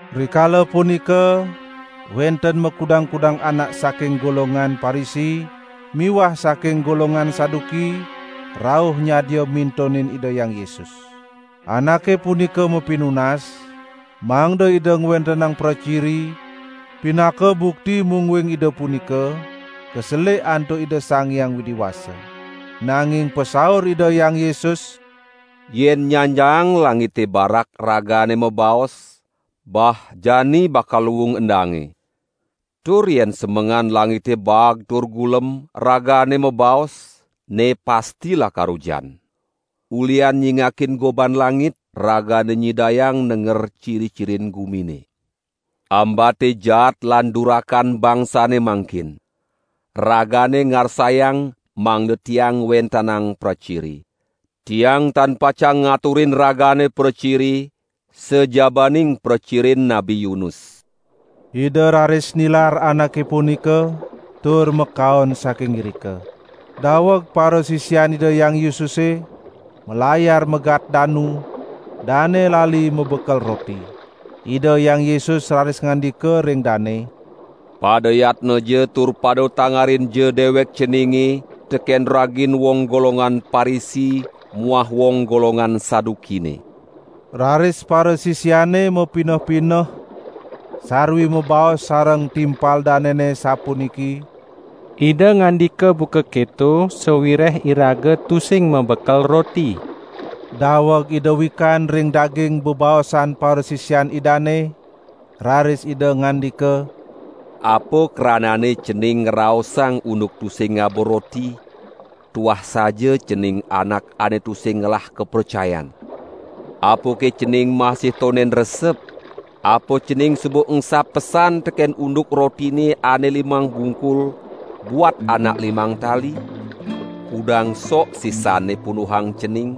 Rikala punika wenten makudang-kudang anak saking golongan Parisi miwah saking golongan Saduki rauh nyadia mintonin Ida Hyang Yesus. Anake punika mapinunas mangda Ida ngwentenang praciri, pinaka bukti mungguing Ida punika kaselik antuk Ida Sang Hyang Widi Wasa. Nanging pasaur Ida Hyang Yesus: "Yen nyanjaang langite barak ragane mabaos: 'Bah jani bakal luung endange.' Tur yen semengan langite baag tur gulem, ragane mabaos: 'Ne pasti lakar ujan.' Ulihan nyingakin goban langit, ragane nyidayang nenger ciri-cirin gumine. Ambate jaat lan durakan bangsane mangkin. Ragane ngarsayang mangda Tiang ngwentenang praciri. Tiang tan pacang ngaturin ragane praciri, sajabaning pracirin Nabi Yunus." Ida raris nilar anake punika, tur makaon saking irika. Daweg parasisian Ida Hyang Yesuse malayar megat danu, dane lali mabekel roti. Ida Hyang Yesus raris ngandika ring dane: "Pada yatnaja tur pada tangarinja dewek ceninge teken ragin wong golongan Parisi muah wong golongan Sadukine." Raris parasisiane mapineh-pineh sarwi mabaos sareng timpal danene sapuniki: "Ida ngandika buka keto sawireh iraga tusing mabekel roti." Daweg Ida wikan ring daging bebaosan parasisian Idane, raris Ida ngandika: "Apa krananne cening ngraosang unduk tusing ngaba roti? Tuah saja cening anak ane tusing ngelah kapracayan! Apake cening masih tonden resep? Apa cening suba engsap pesan teken unduk rotine ane limang bungkul buat anak limang tali? Kudang sok sisanne punduhang cening?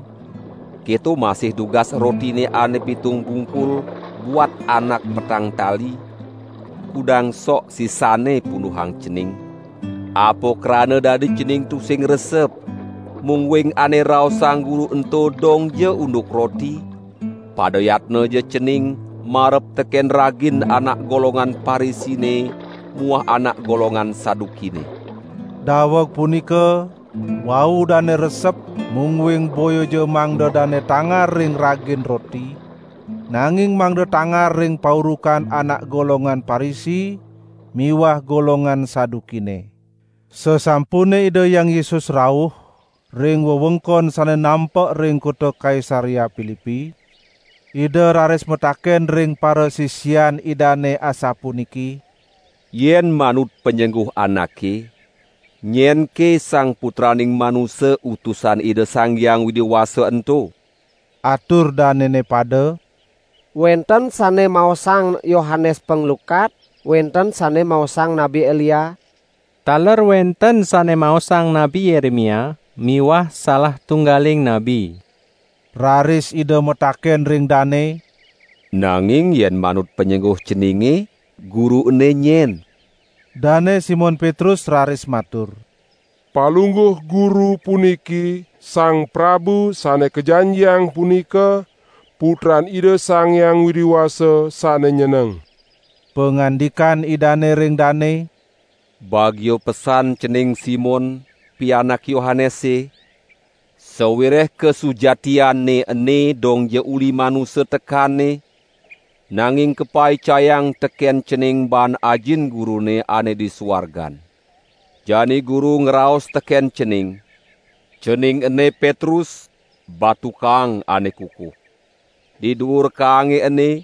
Keto masih dugas rotine ane pitung bungkul buat anak petang tali, kudang sok sisanne punduhang cening? Apa krana dadi cening tusing resep, mungguing ane raosang Guru ento dongja unduk roti? Pada yatnaja cening marep teken ragin anak golongan Parisine muah anak golongan Sadukine!" Daweg punika wau dane resep mungguing boyaja mangda dane tangar ring ragin roti, nanging mangda tangar ring paurukan anak golongan Parisi miwah golongan Sadukine. Sasampune Ida Hyang Yesus rauh ring wewengkon sane nampek ring kota Kaisarea Pilipi, Ida raris mataken ring parasisian Idane asapuniki: "Yen manut panyengguh anake, nyenke Sang Putraning Manusa Utusan Ida Sang Hyang Widi Wasa ento?" Atur danene pada: "Wenten sane maosang Yohanes Panglukat, wenten sane maosang Nabi Elia, taler wenten sane maosang Nabi Yeremia miwah salah tunggaling nabi." Raris Ida mataken ring dane: "Nanging yen manut panyengguh ceninge, Guru ene nyen?" Dane Simon Petrus raris matur: "Palungguh Guru puniki Sang Prabu Sane Kajanjiang punika, Putran Ida Sang Hyang Widi Wasa sane nyeneng." Pangandikan Idane ring dane: "Bagia pesan cening Simon, pianak Yohanese, sawireh kasujatianne ene dongja uli manusa tekanne, nanging kapaicayang teken cening baan Ajin Gurune ane di suargan. Jani Guru ngraos teken cening: Cening ene Petrus batu kaang ane kukuh. Di duur kaange ene,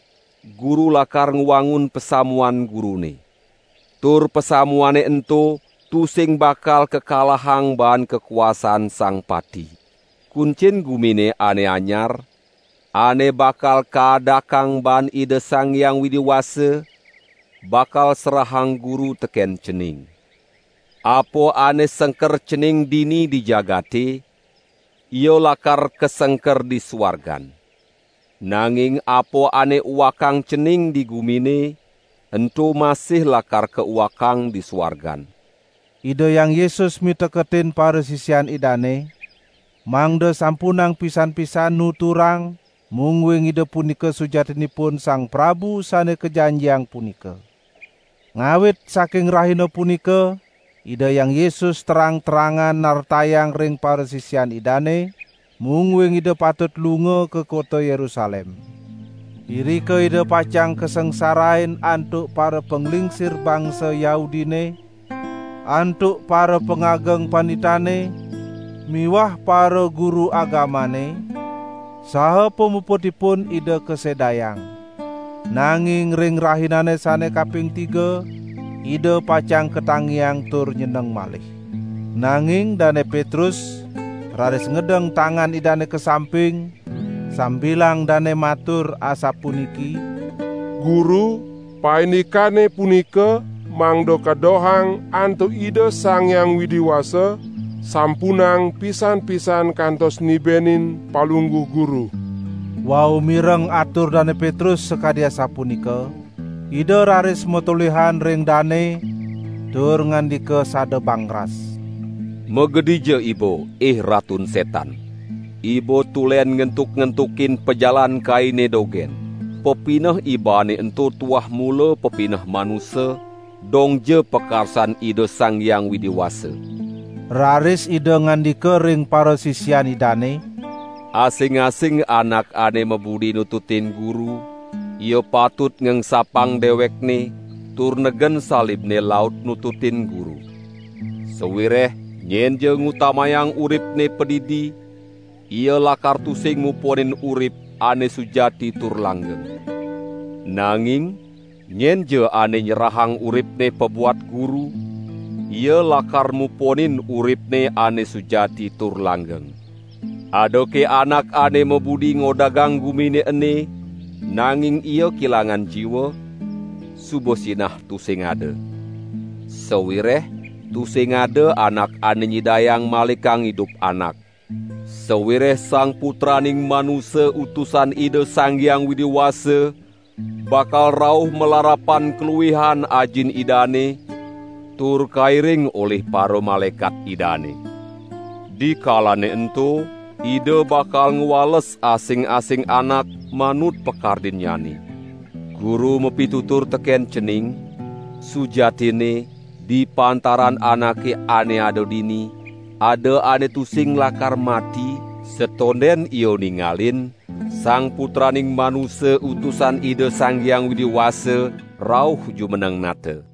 Guru lakar ngwangun pasamuan Gurune. Tur pasamuane ento tusing bakal kakalahang baan kakuasaan Sang Pati. Kuncin Gumine Ane Anyar, ane bakal kaadakang baan Ida Sang Hyang Widi Wasa, bakal serahang Guru teken cening. Apa ane sengker cening dini di jagate, ia lakar kasengker di suargan. Nanging apa ane uakang cening di gumine, ento masih lakar kauakang di suargan." Ida Hyang Yesus miteketin parasisian Idane, mangda sampunang pisan-pisan nuturang mungguing Ida punika sujatinipun Sang Prabu Sane Kajanjiang punika. Ngawit saking rahina punika Ida Hyang Yesus terang-terangan nartayang ring parasisian Idane, mungguing Ida patut lunga ka kota Yerusalem. Irika Ida pacang kasangsarain antuk parapanglingsir bangsa Yahudine, antuk parapangageng panditane miwah paraguru agamane, saha pamuputipun Ida kasedayang. Nanging ring rahinane sane kaping tiga, Ida pacang katangiang tur nyeneng malih. Nanging Dane Petrus raris ngedeng tangan Idane ka samping sambilang dane matur asapuniki: "Guru, paindikane punika mangda kadohang antuk Ida Sang Hyang Widi Wasa, sampunang pisan-pisan kantos nibenin Palungguh Guru." Wau mireng atur Dane Petrus sakadi asapunika, Ida raris matolihan ring dane tur ngandika sada bangras: "Magedija iba ih Ratun Setan. Iba tulen ngentuk-ngentukin pajalan Kaine dogen. Pepineh ibane ento tuah mula pepineh manusa, dongja pakarsan Ida Sang Hyang Widi Wasa." Raris Ida ngandika ring parasisian Idane: "Asing-asing anak ane mabudi nututin Guru, ia patut ngengsapang dewekne, tur negen salibne laut nututin Guru. Sawireh nyenja ngutamayang uripne padidi ia lakar tusing muponin urip ane sujati tur langgeng. Nanging nyenja ane nyerahang uripne pabuat Guru, ia lakar muponin uripne ane sujati tur langgeng. Adake anak ane mabudi ngodagang gumine ene, nanging ia kelangan jiwa? Suba sinah tusing ada. Sawireh tusing ada anak ane nyidayang malikang idup anak. Sawireh Sang Putraning Manusa Utusan Ida Sang Hyang Widi Wasa bakal rauh malarapan kaluihan Ajin Idane, tur kairing olih paramalaekat Idane. Dikalane ento Ida bakal ngwales asing-asing anak manut pakardinnyane. Guru mapitutur teken cening: sujatinne di pantaran anake ane ada dini, ada ane tusing lakar mati, satonden ia ningalin Sang Putraning Manusa Utusan Ida Sang Hyang Widi Wasa rauh jumeneng Nata."